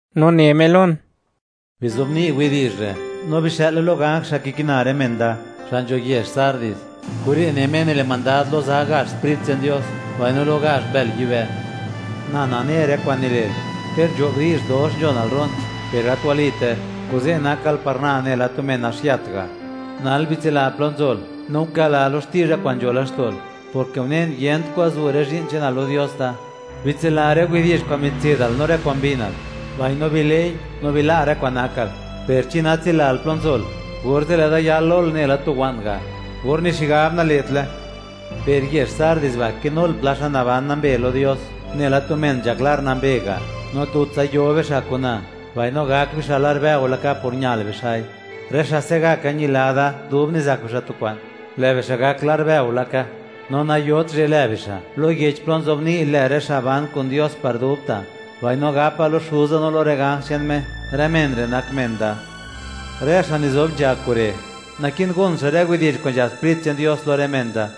No ne Me lon: ―Bizobni' widi'zh re' no bixë'le lo ganj xa' kikina rë men da, xa' nzho yezh Sardis: “Kure' ne Me nile' mandad lo za gazh sprit che'n Dios, mbaino lo gazh mbël yibë': Na nane rë kwa'n nile'l. Ter nzho'b di'zh, dox nzhonal ro'n, per gat walite; kuze' nakal par Na nela tu men naxiat ga'. Nal, bitsila plo nzol, no guka'la lo xti'zha kwa'n nzho laxto'l, porke unen, yent kwan zu' rë zhi'n che'nal lo Dios Da. Bitsila rë widi'zh kwa'n mitse'dal no rë kwa'n mbinal, mbaino bile'i, no bila' rë kwa'n nakal; per chi natsilal plo nzol, orze' lë' Da yal lol nela tu wa'n ga', or ni xigab nale'tle. Per yezh Sardis ba', kinul pla xa' naban nambe lo Dios, nela tu men nzhak lar nambe ga'; no tutsa yo bixa' kun Na, mbaino gak bixa' lar bëo laka por ñal bixa'i. Rë xa' se'gaka yila Da dub nizak bixa' tu kwa'n, lë' bixa' gak lar bëo laka, no nayot zhe' lë bixa' lo yech plo nzobni' lë rë xa' ban kun Dios par dubta'; mbaino gapa lo Xuza no lo rë ganj che'n Me, rë men re' nak men Da. Rë xa' nizob nzha kure', naki'n gon xa' rë widi'zh kwa'n nzhab Sprit che'n Dios lo rë men da.”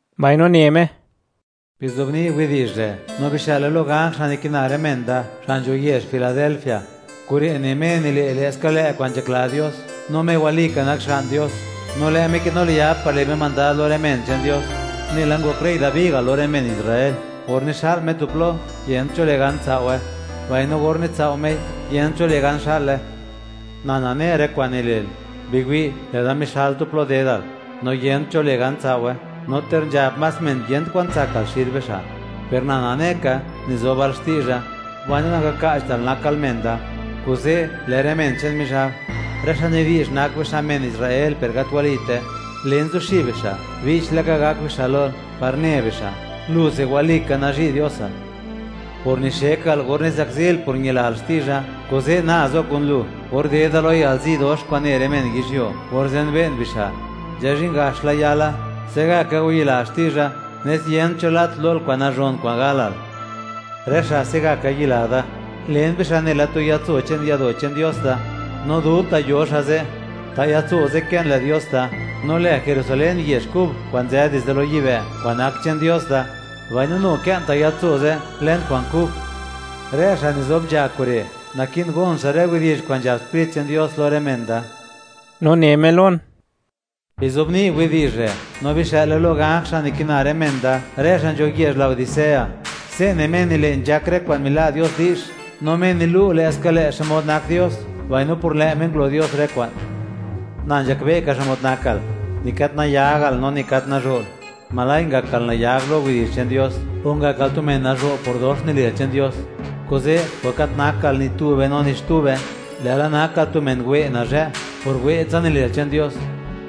Mbaino ne Me: ―Bizobni' widi'zh re' no bixë'le lo ganj xa' nikina rë men Da xa' nzho yezh Filadelfia: “Kure' ne Me nile' lë'ska lë' kwa'n nzhakla Dios, no Me walika nak Xga'n Dios, no lë' Me kinu liab par le' Me mandad lo rë men che'n Dios, nela ngok rey Dabi ga' lo rë men Israel; or nixa'l Me tu plo, yent cho le' gan tsao'we, mbaino or nitsao' Mei, yent cho le' gan xa'le: Na nane rë kwa'n nile'l. Biwi', lë' Da mixal tu plo dedal, no yent cho le' gan, tsao'we; no ter nzhab más men yent kwan tsakal xid bixa', per Na nane ka, nizobal xti'zha, mbaino nangaka'chtal nakal men da. Kuze', lë' rë men che'n Mizhab, rë xa' nidi'zh nak bixa' men Israel per gat walite; len, zuxib bixa', che'ptsa (bi'ch laka) gak bixa' lol, par ne bixa', luse walika nazhi' Diosal. Por nixekal or nizakzil por ñilal xti'zha, kuze' na zo kun lu or dedal lo yalzi dox kwa'n ne rë men yizhyuo, or zenbe'n bixa' (or wi'n xmod nak bixa'). Nzhazhin gax la yala; se'gaka wayila xti'zha, nes yent cho lat lol kwa'n nazhon kwa'n galal. Rë xa' se'gaka yila Da, len bixa' nela tu yatso che'n yado' che'n Dios Da, no dubta' yo xa' ze'. Ta' yatso ze' kë'n lë Dios Da, no lë Jerusalén yezh kub, kwa'n nzë dizde lo yibë', kwa'n nak che'n Dios Da; mbaino nu kë'n ta' yatso ze' lën kwa'n kub. Rë xa' nizob nzha kure', naki'n gon xa' rë widi'zh kwa'n nzhab Sprit che'n Dios lo rë men da.” No ne Me lon: ―Bizobni' widi'zh re' no bixë'le lo ganj xa' nikina rë men Da, rë xa' nzho yezh Laodicea: “Se' ne Me nile' nzhak rë kwa'n mila' Dios di'zh, no Me nilu' lë'ska lë' xmod nak Dios, mbaino por lë' Me ngulo Dios rë kwa'n: Na nzhakbe' ka xmod nakal; ni gat nayagal, no ni gat nazho'l, ¡ojla' ngakal nayag lo widi'zh che'n Dios o ngakal tu men nazho' por dox nile'l che'n Dios! Kuze', por gat naktal ni tube no ni xtube, lë'la nakal tu men wë' nazhë' por wë'tsa nile'l che'n Dios,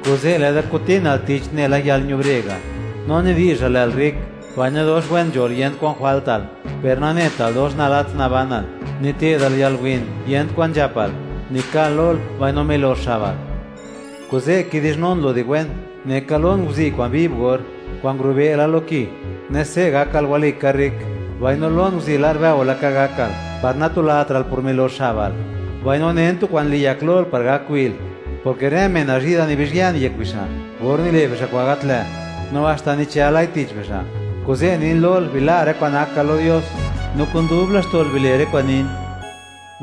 kuze' lë' Da kutinal tich, nela yalñubre ga'. No nidi'zhal, lë'l rrik, mbaino dox wen nzhol, yent kwan jwaltal, per nanetal dox nalats nabanal, nite'dal yalwin, yent kwan nzhapal, nikal-lol, mbaino milox xabal. Kuze' kidi'zhnun lu di wen, neka lon guzi' kwa'n viv or, kwa'n ngurube' la lo ki, nes se' gakal walika rrik; mbaino lon guzi' lar bëo laka gakal par natulatra'l por milox xabal, mbaino nen tu kwa'n liyak lol, par gak wi'l, porke rë men nazhi' Da, nibizhyën yek bixa' or nile' bixa' kwa'n gat lë', no haxta nichëlai tich bixa'; kuze' nin lol, bila' rë kwa'n nakal lo Dios, no kun dub laxto'l bile' rë kwa'n nin.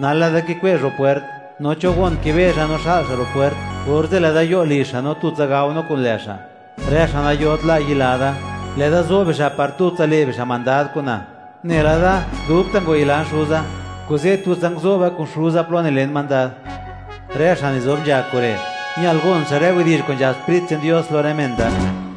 Nal, lë' Da kikwe'zh ro' pwert; no cho gon kibezha no xa'l xa' ro' pwert, orze' lë' Da yo' lizh xa', no tutsa gao no kun lë' xa'. Rë xa' nayot la' yila Da, lë' Da zo bixa' par tutsa le' bixa' mandad kun Na; nela Da dubta' ngwayilan Xuza, kuze' tutsa nguzo'ba kun Xuza plo nile' Me mandad. Rë xa' nizob nzha kure', ñal gon xa' rë widi'zh kwa'n nzhab Sprit che'n Dios lo rë men da.”